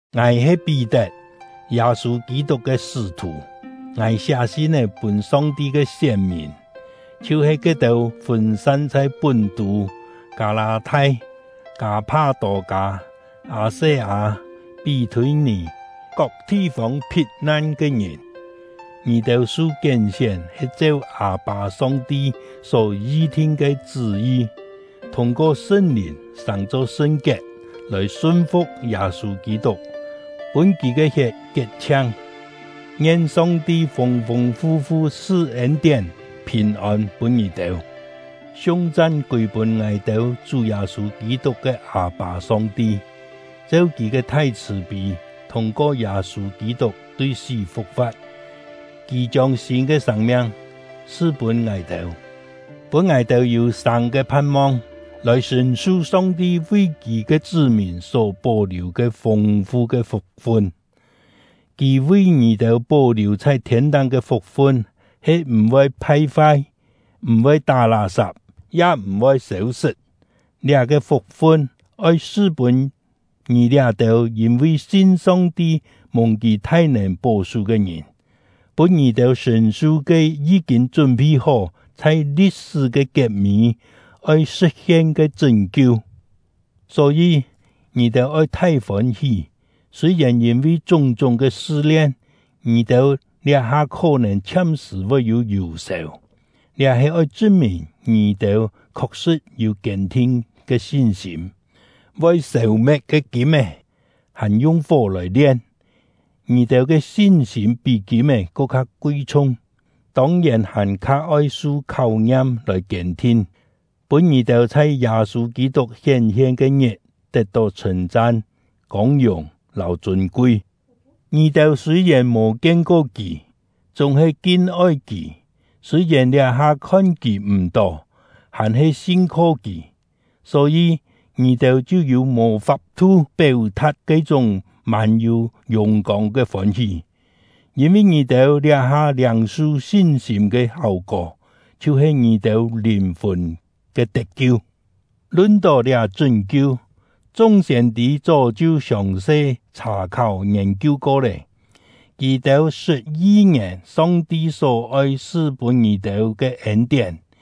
Ngài he Pí-tet, Yâ-sû Kî-tuk ke sṳ́-thù. Ngài siá sin-é pûn Song-ti ke sién-mìn, chhiu-he ke-têu fûn-san chhai Pún-tû, Kâ-lâ-thai, Kâ-pha-tô-kâ, Â-se-â, Pí-thûi-nì kok thi-fông phit-nan ke ngìn. Ngì-têu su kién-sién he cheu Â-pâ Song-ti só yi-thin ke chṳ́-yi, thûng-ko Sṳn-Lìn sàng-cho sṳn-kiet, lòi sun-fu̍k Yâ-sû Kî-tuk, pûn kì ke hiet kiet-chhiang. Ngien Song-ti fûng-fûng fu-fu su ên-tién, phìn-ôn pûn ngì-têu! Siung-chan kûi-pûn ngài-têu Chú Yâ-sû Kî-tuk ke Â-pâ Song-ti! Cheu Kì ke thai chhṳ̀-pî, thûng-ko Yâ-sû Kî-tuk tui sí fu̍k-fa̍t, Kì chiông sîn ke sâng-miang su-pûn ngài-têu, pûn ngài-têu yû sâng ke phan-mong, lòi sṳ̀n-su Song-ti vi Kì ke chṳ́-mìn só pó-liù ke fûng-fu ke fuk-fun. Kì vi ngì-têu pó-liù chhai thiên-táng ke fuk-fun he m̀-voi phai-fai, m̀-voi tá lá-sap, ya m̀-voi sêu-sṳt. Liá-ke fuk-fun oi su-pûn ngì liá-têu yîn-vi sin Song-ti mùng Kì thai-nèn pó-sú ke ngìn, pûn ngì-têu sṳ̀n-su ke yí-kîn chún-phi-hó, chhai li̍t-sṳ́ ke kiet-mî oi sṳ̍t-hien ke chṳ́n-kiu. Só-yî, ngì-têu oi thai fôn-hí, sûi-yèn yîn-vi chúng-chúng ke sṳ-lien, ngì-têu liá-ha khó-nèn chhiam-sṳ̀ voi yû yù-sèu. Liá he oi chṳn-mìn ngì-têu khok-sṳ̍t yû kiên-thin ke sin-sîm. Voi sêu-me̍t ke kîm-é, hàn yung fó lòi lien; ngì-têu ke sin-sîm pí kîm-é ko kha kui-chhung, tông-yèn hàn-kha oi su kháu-ngiam lòi kiên-thin, pûn ngì-têu chhai Yâ-sû Kî-tuk hién-hien ke-ngit tet-tó chhṳ̂n-chan, kông-yùng, lâu chûn-kui. Ngì-têu sûi-yèn mò kien-ko kì, chúng-he kin-oi kì; sûi-yèn liá-ha khon kì m̀-tó, hàn-he sin-kho kì. Só-yî, ngì-têu chhiu yû mò fap-thu péu-tha̍t ke-chúng mân-yû yùng-kông ke fôn-hí, yîn-vi ngì-têu liá-ha liâng-su sin-sîm ke háu-kó, chhiu-he ngì-têu lìn-fùn ke tet-kiu. Lun-tó liá chṳ́n-kiu, chung siên-tî chó chhiu siòng-se chhà-kháu ngiên-kiu ko lé, kì-têu sṳt yi-ngièn Song-ti só-oi su pûn ngì-têu ke ên-tién.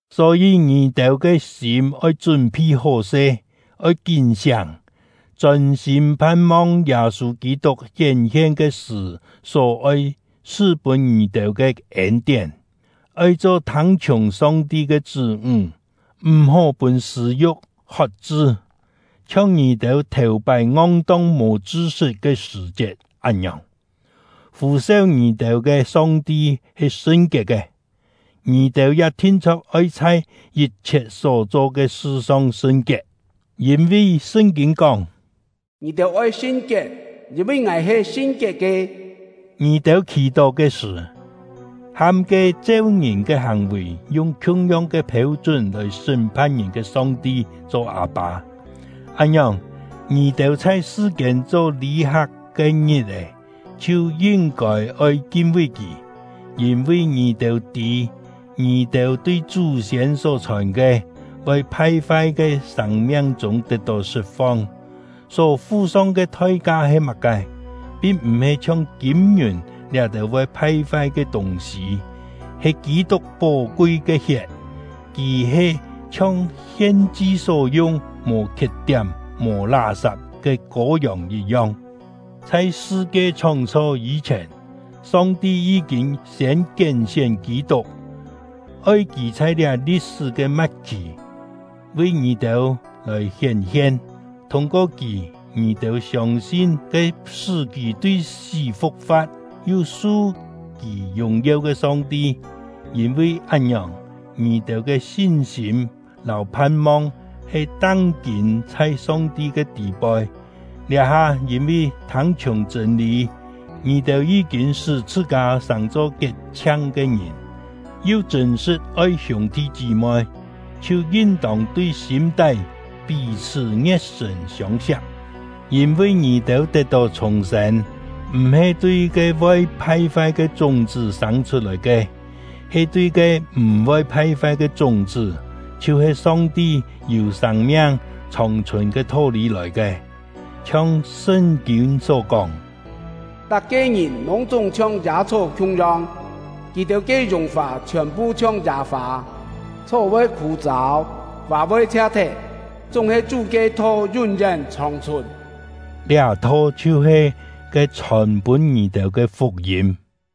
Só-yî, ngì-têu ke sîm oi chún-phi hó-se; oi kín-siáng, chôn-sîm phan-mong Yâ-sû Kî-tuk hién-hien ke-sṳ̀ só-oi su-pûn ngì-têu ke ên-tién. Oi cho thâng-chhiùng Song-ti ke chṳ́-ńg, m̀-hó pûn sṳ̂-yu̍k hot-chṳ, chhiong ngì-têu thèu-pái ngong-tong mò chṳ-sṳt ke sṳ̀-chiet án-ngiòng. Fû-seu ngì-têu ke Song-ti he sṳn-kiet ke; ngì-têu ya thin-chho̍k oi chhai yit-chhiet só cho ke sṳ-song sṳn-kiet; yîn-vi Sṳn-kîn kóng: “Ngì-têu oi sṳn-kiet, yîn-vi Ngài he sṳn-kiet ke.” Ngì-têu khì-tó ke sṳ̀, ham ke cheu ngìn ke hàng-vì, yung khiung-yong ke phêu-chún lòi sṳ́m-phan ngìn ke Song-ti cho Â-pâ; án-ngiòng, ngì-têu chhai sṳ-kiên cho lî-hak ke ngit-è chhiu yin-kôi oi kin-vi Kì. Yîn-vi ngì-têu tî, ngì-têu tui chú-siên só-chhòn ke, voi phai-fai ke sâng-miang-chûng tet-tó sṳt-fong, só fu-song ke thoi-ka he má-ke. Pin m̀-he chhiong kîm-ngiùn liá-têu voi phai-fai ke tûng-sî, he Kî-tuk pó-kui ke hiet; Kì he chhiong hien-chi só yung, mò khiet-tiám mò lá-sap ke kâu-yòng yit-yong. Chhai sṳ-kie chhóng-chho yî-chhièn, Song-ti yí-kîn siên kién-sién Kî-tuk, oi kì chhai liá li̍t-sṳ́ ke ma̍t-khì vi ngì-têu lòi hién-hien. Thûng-ko kì, ngì-têu siông-sin ke sṳ́ kì tui sí fu̍k-fa̍t, yu su kì yùng-yeu ke Song-ti; yîn-vi án-ngiòng, ngì-têu ke sin-sîm lâu phan-mong he tang-kîn chhai Song-ti ke tî-poi. Liá-ha, yîn-vi thâng-chhiùng chṳ̂n-lî, ngì-têu yí-kîn sṳ́ chhṳ-kâ sàng-cho kiet-chhiang ke ngìn, yu chṳ̂n-sṳ̍t oi hiûng-thi chí-moi, chhiu yin-tông tui sîm-tái pí-chhṳ́ ngie̍t-sṳ̀n siông-siak. Yîn-vi ngì-têu tet-tó chhùng-sên, m̀-he tui ke voi phai-fai ke chúng-chṳ́ sâng chhut-lòi ke, he tui ke m̀-voi phai-fai ke chúng-chṳ́, chhiu-he Song-ti yû sâng-miang, chhòng-chhùn ke tho-lî lòi ke. Chhiong Sṳn-kîn só kóng: Tak-ke ngìn lûng-chúng chhiong yâ-chhó khiung-yong, kì-têu ke yùng-fà chhiòn-phu chhiong yâ-fâ; chhó voi khû-châu, fâ voi chhia-thet, chúng-he Chú ke tho yún-yén chhòng-chhùn! Liá tho chhiu-he ke chhòn-pûn ngì-têu ke fuk-yîm.